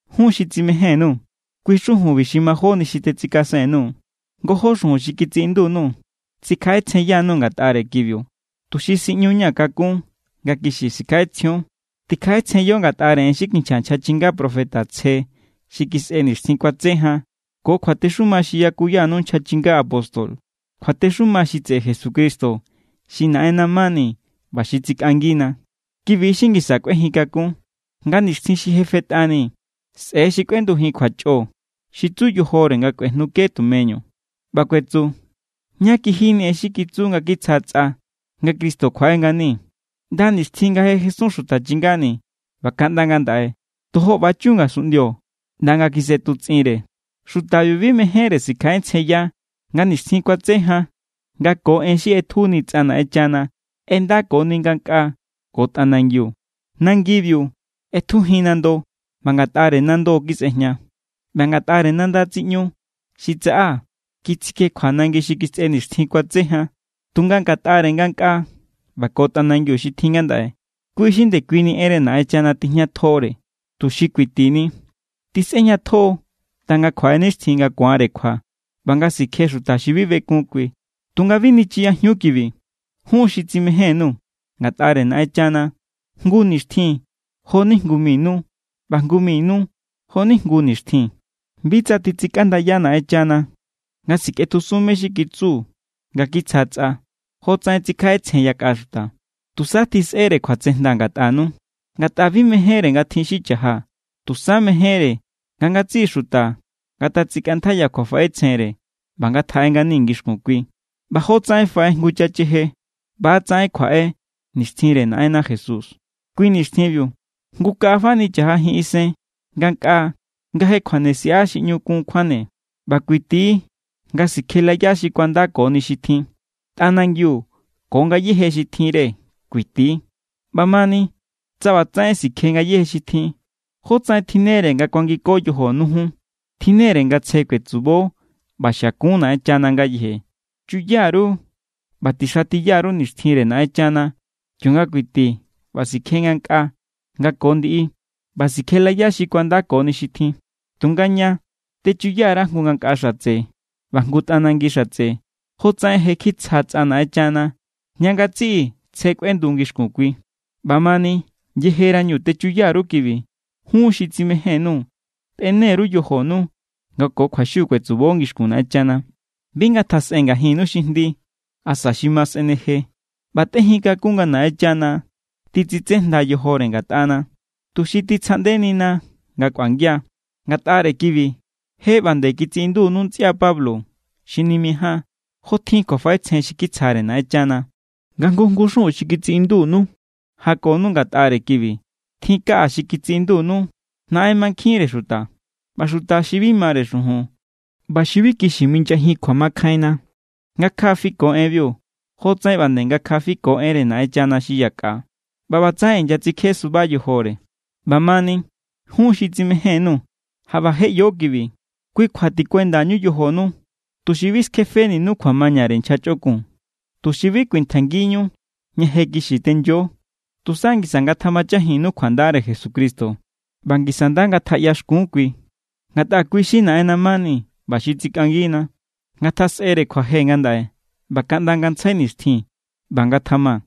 Jun xi tsimején_nuu̱, kui xujunbi xi majóni xi tetsikasen_nuu̱. Ngojó xujun xi kitsiꞌindu_nuu̱ tsikjaꞌetsjenyanu ngatꞌare kibiu, tuxi siꞌñuña̱ kakun nga kixi sikjaꞌetsjion. Tikjaꞌetsjenyo ngatꞌare en xi kinchja nchja chinga profeta tsje xi kisꞌe nixtjin kuatse jan ko kjuatexuma xi yakuyanu nchja chinga apóstol, kjuatexuma xi tseꞌe Jesucristo xi Naꞌenna mani ꞌba xi tsikꞌangina. Kibi= xi ngisa kꞌuejin kakun. Nga nixtjin xi je fetꞌani sꞌe̱= xi kꞌuendujin kjuachꞌo xi tsu yojore nga kuejnuke tumeñu. ꞌBa kuetsu: “¿Ná kijini en xi kitsu nga kitsja tsꞌa, nga Cristo kjuaꞌe ngani? ꞌNda nixtjin nga je jesun xuta chingani̱ ꞌba kaꞌnda ngandaꞌe, tojo ꞌba=chun ngasunꞌndio ꞌnda nga kjisꞌetutsꞌinre.” Xutabiu bi mejénre sikjaꞌetsjenya nga nixtjin kuatse jan nga ko en xi ꞌetjuni tsꞌa Naꞌenchana ꞌendakoni ngankꞌaa ko tꞌanangiu. Nangibiu ꞌetjujin nando ꞌba ngatꞌare nando= kisꞌejña. ꞌBa ngatꞌare nandare tsiꞌñu xi tsaꞌa kitsikjekjua nangi xi kisꞌe nixtjin kuatse jan. Tunga ngatꞌare ngankꞌaa ꞌba ko tꞌanangi xi tjin ngandaꞌe, kui= xi ndekuini enre Naꞌenchana tijñatjore, tuxi kuitini. Tisꞌejñatjo= ꞌnda nga kjuaꞌe nixtjin nga ku̱anre kjua ꞌba nga sikje xuta xi bi bekun kui. Tunga bi nichiyajiun kibi, jun xi tsimején_nuu̱. Ngatꞌare Naꞌenchana jngu nixtjin jo=ni jngu mi nu ꞌba jngu mi nu jo=ni jngu nixtjin. Bi tsa titsikꞌandaya Naꞌenchana nga sikꞌetjusun mé= xi kitsu nga kitsja tsꞌa, jotsaꞌen tsikjaꞌetsjen yakꞌa xuta. Tusa tjisꞌere kjuatsejnda ngatꞌanu, ngatꞌa bi mejénre nga tjin xi cha̱ja. Tusa mejénre nga ngatsiꞌi xuta ngatatsikꞌantjaiya kjuafaꞌetsjenre ꞌba ngatjaꞌe ngani ngixkun kui. ꞌBa jotsaꞌen faꞌe jngu chacheje, ꞌba=tsaꞌen kjuaꞌe nixtjinre Naꞌenna Jesús. Kui nixtjinbiu jngu kaꞌa fani cha̱jajin isen ngankꞌaa nga je kjuane siꞌa xi ꞌñu kun kjuane. ꞌBa kuiti= nga sikjelaya xi kuandakoni xi tjin. Tꞌanangiu ko ngayéje xi tjinre kuiti=. ꞌBamani tsa ꞌbatsaꞌen sikje ngayéje xi tjin, ¿jótsaꞌen tjinnere nga kuangiko yojonu jun? Tjinne=re nga tsje kuetsubo ꞌba xiakun Naꞌenchana ngayeje. Chuya_ru ꞌba tixatiya_ru nixtjinre Naꞌenchana kionga kuiti ꞌba sikje ngankꞌaa nga ko ndiꞌi ꞌba sikjelaya xi kuandakoni xi tjin. Tunga ña, techuya_ra jngu ngankꞌa xatse ꞌba jngu tꞌanangi xatse, jotsaꞌen je kitsja tsꞌa Naꞌenchana ña ngatsiꞌi tsje kꞌuendu ngixkun kui. ꞌBamani yejerañu techuya_ru kibi, jun xi tsimején_nuu̱, tꞌene_ru yojonu nga ko kjuaxiu kuetsubo ngixkun Naꞌenchana. Bi ngatjasꞌe ngajinnu xi jndi asa xi ma sꞌe̱neje. ꞌBa tꞌejin takún nga Naꞌenchana titsitsejnda yojore ngatꞌana, tuxi titsjaꞌndenina nga kꞌuangia. Ngatꞌare kibi je ꞌba nde kitsiꞌindunu ntsꞌia Pablo xi nimijáan, jotjin kjuafaꞌetsjen xi kitsjare Naꞌenchana. Nga jngu jngu xujun xi kitsiꞌindunu jakonu ngatꞌare kibi. Tjin kaꞌa xi kitsiꞌindu naꞌen mankjinre xuta. ꞌBa xuta xi bi mare xujun ꞌba xi bi kixi minyajin kjuamakjainna ngakja fiko enbiu jotsaꞌen ꞌba nde ngakja fiko enre Naꞌenchana xi yakꞌa, ꞌba ꞌbatsaꞌen inyatsikje suba yojore. ꞌBamani jun xi tsimején_nuu̱, jaꞌba je ꞌyo kibi. Kui kjua tikuendañu yojonu, tuxi bi skjefeninu kjuamañare nchja chꞌokun, tuxi bi kuintjaingiñu ña je kixi tenyo. Tusa ngisa ngatjamachajinnu kjuandare Jesucristo ꞌba ngisa nda ngatjaꞌyaxkun kui, ngatꞌa kui= xi Naꞌenna mani ꞌba xi tsikꞌangina. ¡Ngatjasꞌere kjuaje ngandaꞌe ꞌba kaꞌnda ngantsjai nixtjin! ꞌBa ngatjama.